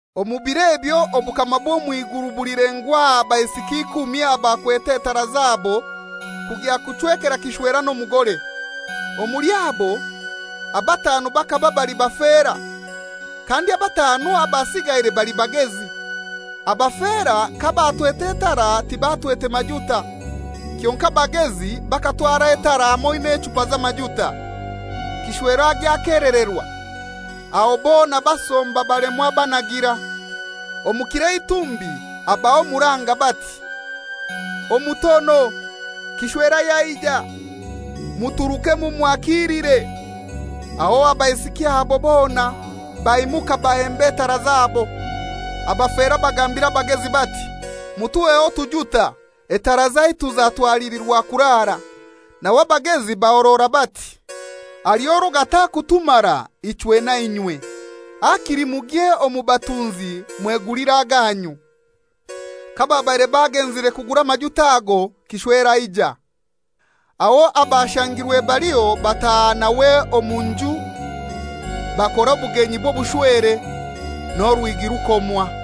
«Omu bir'ebyo obukama bw'omw'iguru bulilengwa aha baisiki ikumi abakwete etara zabo kugya kuchwekera kishwera n'omugore. Omuli abo, abatanu bakaba bali bafera, kandi abatanu abasigaire bali bagezi. Abafera kabatwete etara tibatwete majuta. Kyonkai abagezi bakatwara etara hamoi n'echupa z'amajuta. Kishwera agya akelererwa, aho bona basomba balemwa banagira. Omu kiro eitumbi habaho omuranga bati, ‹Omutono, kishwera yaija! Muturuke mumwakiilire.› Aho abaisiki abo bona baimuka bahemba etara zabo. Abafera bagambira abagezi bati, ‹Mutuheho otujuta, etara zaitu zatwalilirwa kuraara.› Nawe abagezi bahorora bati, ‹Haliho orwo gatakutumara ichwe na inywe; hakili mugye omu batunzi mwegulire aganyu.›» «Kababaire bagenzire kugura amajuta ago, kishwera aija, aho abashangirwe baliho bataaha nawe omu nju bakora obugenyi bw'obushwere; n'orwigi rukomwa.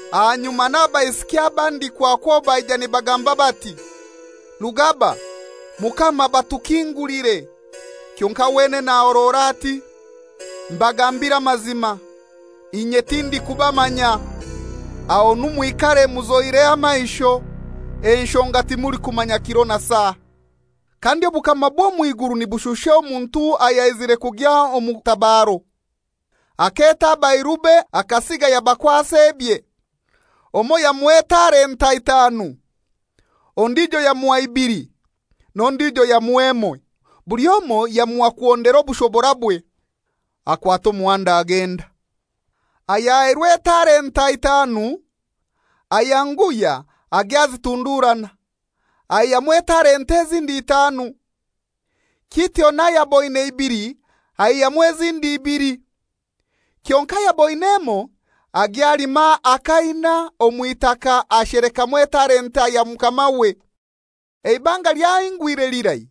Ahanyuma n'abaisiki abandi kwakwo baija nibagamba bati, ‹Rugaba, mukama batukingulire.› Kyonkai wenene ahorora ati, ‹Mbagambiire amazima, inye tindikubamanya.› Ahonu mwikare muzoire amaisho, enshonga timulikumanya kiro na saa.» «Kandi obukama bw'omw'iguru nibushusha omuntu ayaizire kugya omu tabaro, aketa abairube akasiga yabakwasa ebye. Omoi yamuha etalenta itanu, ondijo yamuha ibili n'ondijo yamuha emoi; buli omoi yamuha kuhondera obushoborabwe. Akwata omuhanda agenda. Ayahairwe etalenta itanu ayanguhya agya azitunduurana, aihyamu etalenta ezindi itanu. Kityo n'ayaboine ibili aihamu ezindi ibili. Kyonkai ayaboine emoi, agya alima akaina omw'itaka ashelekamu etalenta ya mukamawe. Eibanga lyahingwire lirai,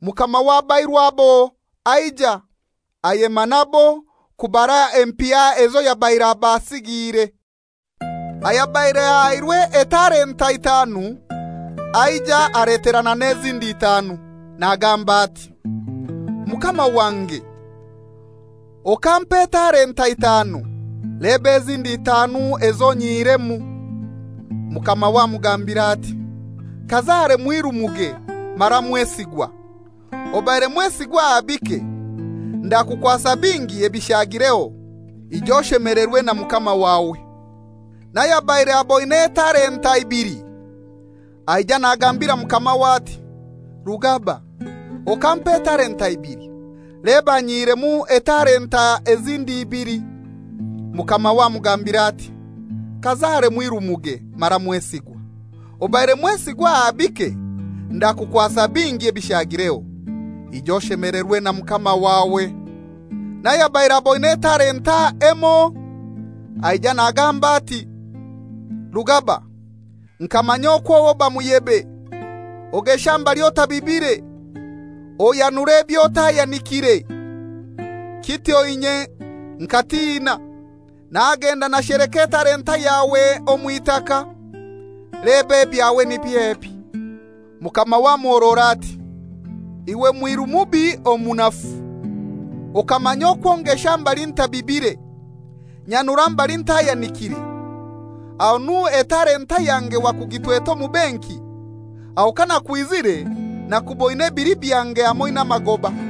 mukama w'abairu abo aija, ayema nabo kubara empiha ezo yabaire abasigiire. Ayabaire ahairwe etalenta itanu aija aleterana n'ezindi itanu, nagamba ati, ‹Mukama wange okampa etalenta itanu, leba ezindi itanu ezo nyihiremu.› Mukamawe amugambira ati, ‹Kazare mwiru muge mara mwesigwa; obaire mwesigwa aha bike, ndakukwasa bingi ebishagireho; ija oshemelerwe na mukama wawe.› N'ayabaire aboine etalenta ibili aija nagambira mukamawe ati, ‹Rugaba, okampa etalenta ibili, leba nyihiremu etalenta ezindi ibili.› Mukamawe amugambira ati, ‹Kazare mwiru muge mara mwesigwa; obaire mwesigwa aha bike, ndakukwasa bingi ebishagireho; ija oshemelerwe na mukama wawe.› N'ayabaire aboine etalenta emoi aija nagamba ati, ‹Rugaba, nkamanya okw'oba muyebe, ogesha mbali otabibire, oyanura eby'otayanikire. Kityo inye nkatina, nagenda nasheleka etalenta yawe omw'itaka. Leba ebyawe niby'ebi.› Mukamawe amuhorora ati, ‹Iwe mwiru mubi omunafu! Okamanya okwo ngesha mbali ntabibire, nyanura mbali ntayanikiire? Ahonu etalenta yange wakugitwete omu benki, aho kanakwizire nakuboine ebili byange hamoi n'amagoba.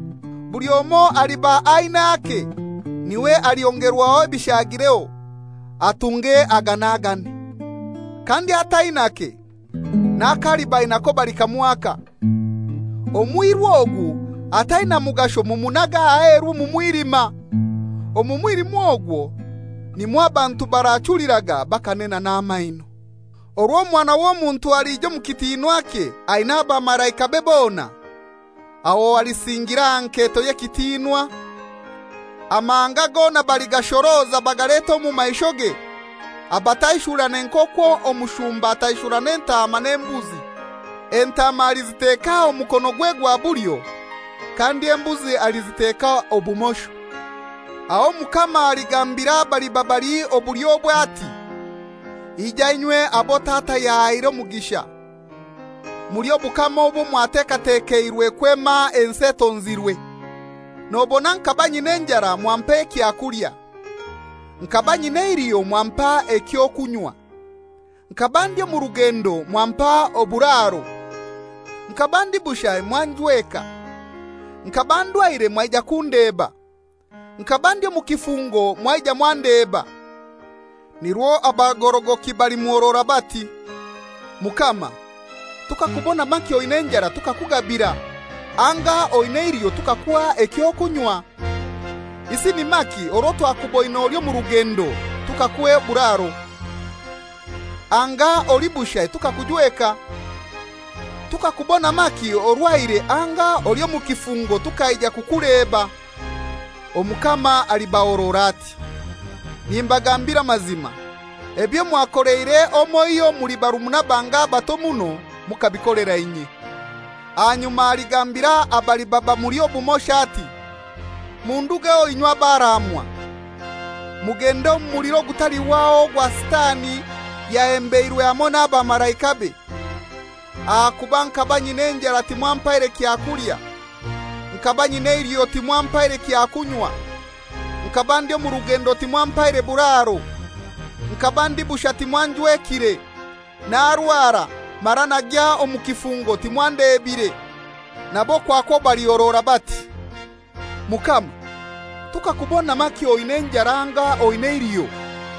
Buli omoi aliba ain'ake niwe alyongerwaho ebishagireho, atunge aganagane. Kandi atainake, n'ako aliba ainako balikamwaka. Omwiru ogu ataina mugasho mumunage aheru omu mwilima; omu mwilima ogwo nimwo abantu barachuliraga bakanena n'amaino.›» «Orwo Omwana w'Omuntu alija omu kitinwakye aina abamalaikabe bona, aho alisingira aha nketo ey'ekitinwa. Amahanga gona baligashoroza bagalete omu maishoge, abataishurane nk'okwo omushumba ataishurana entaama n'embuzi. Entaama aliziteka omukonogwe gwa bulyo, kandi embuzi aliziteka obumosho. Aho Omukama aligambira abaliba bali obulyobwe ati, ‹Ija inywe abo Tata yahaire omugisha, mulye obukama obwo mwatekatekeirwe kwema ensi etonzirwe. Nobona nkaba nyina enjara mwampa ekyakulya, nkaba nyina eiliho mwampa eky'okunywa, nkaba ndi omu rugendo mwampa oburaro; nkaba ndi bushai mwanjweka, nkaba ndwaire mwaija kundeba, nkaba ndi omu kifungo mwaija mwandeba.› Nirwo abagorogoki balimuhorora bati, ‹Mukama, tukakubona maki oina enjara tukakugabira, anga oin'eiliho tukakuha eky'okunywa? Isi ni maki orwo twakuboine oli omu rugendo tukakuha oburaro, anga oli bushai tukakujweka? Tukakubona maki orwaire anga oli omu kifungo tukaija kukuleba?› Omukama alibahorora ati, ‹Nimbagambira amazima, ebyo mwakoleire omoiho omuli barumuna bange abato muno, mukabikolera inye.› Ahanyuma aligambira abaliba bamuli obumosho ati, ‹Mundugeho inywe abaraamwa, mugende omu muliro ogutalihwaho ogwo Sitani yahembeirwe hamoi n'abamalaikabe. Ahakuba nkaba nyina enjara timwampaire kyakulya, nkaba nyina eiliho timwampaire kyakunywa; nkaba ndi omu rugendo timwampaire buraro, nkaba ndi bushai timwanjwekire, narwara, mara nagya omu kifungo timwandebire.› Nabo kwakwo balihorora bati, ‹Mukama, tukakubona maki oina enjara anga oin'eiliho,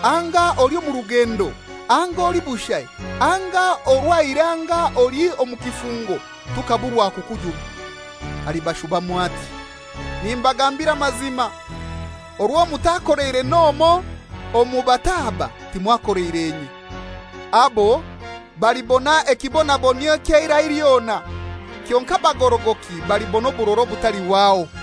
anga oli omu rugendo, anga oli bushai, anga orwaire anga oli omu kifungo tukaburwa kukujuna?› Alibashubamu ati, ‹Nimbagambira amazima, orwo mutakoleire n'omoi omu bato aba, timwakoleire inye.› Abo balibona ekibonabonyio eky'eirai lyona, kyonkai abagorogoki balibona oburora obutalihwaho.»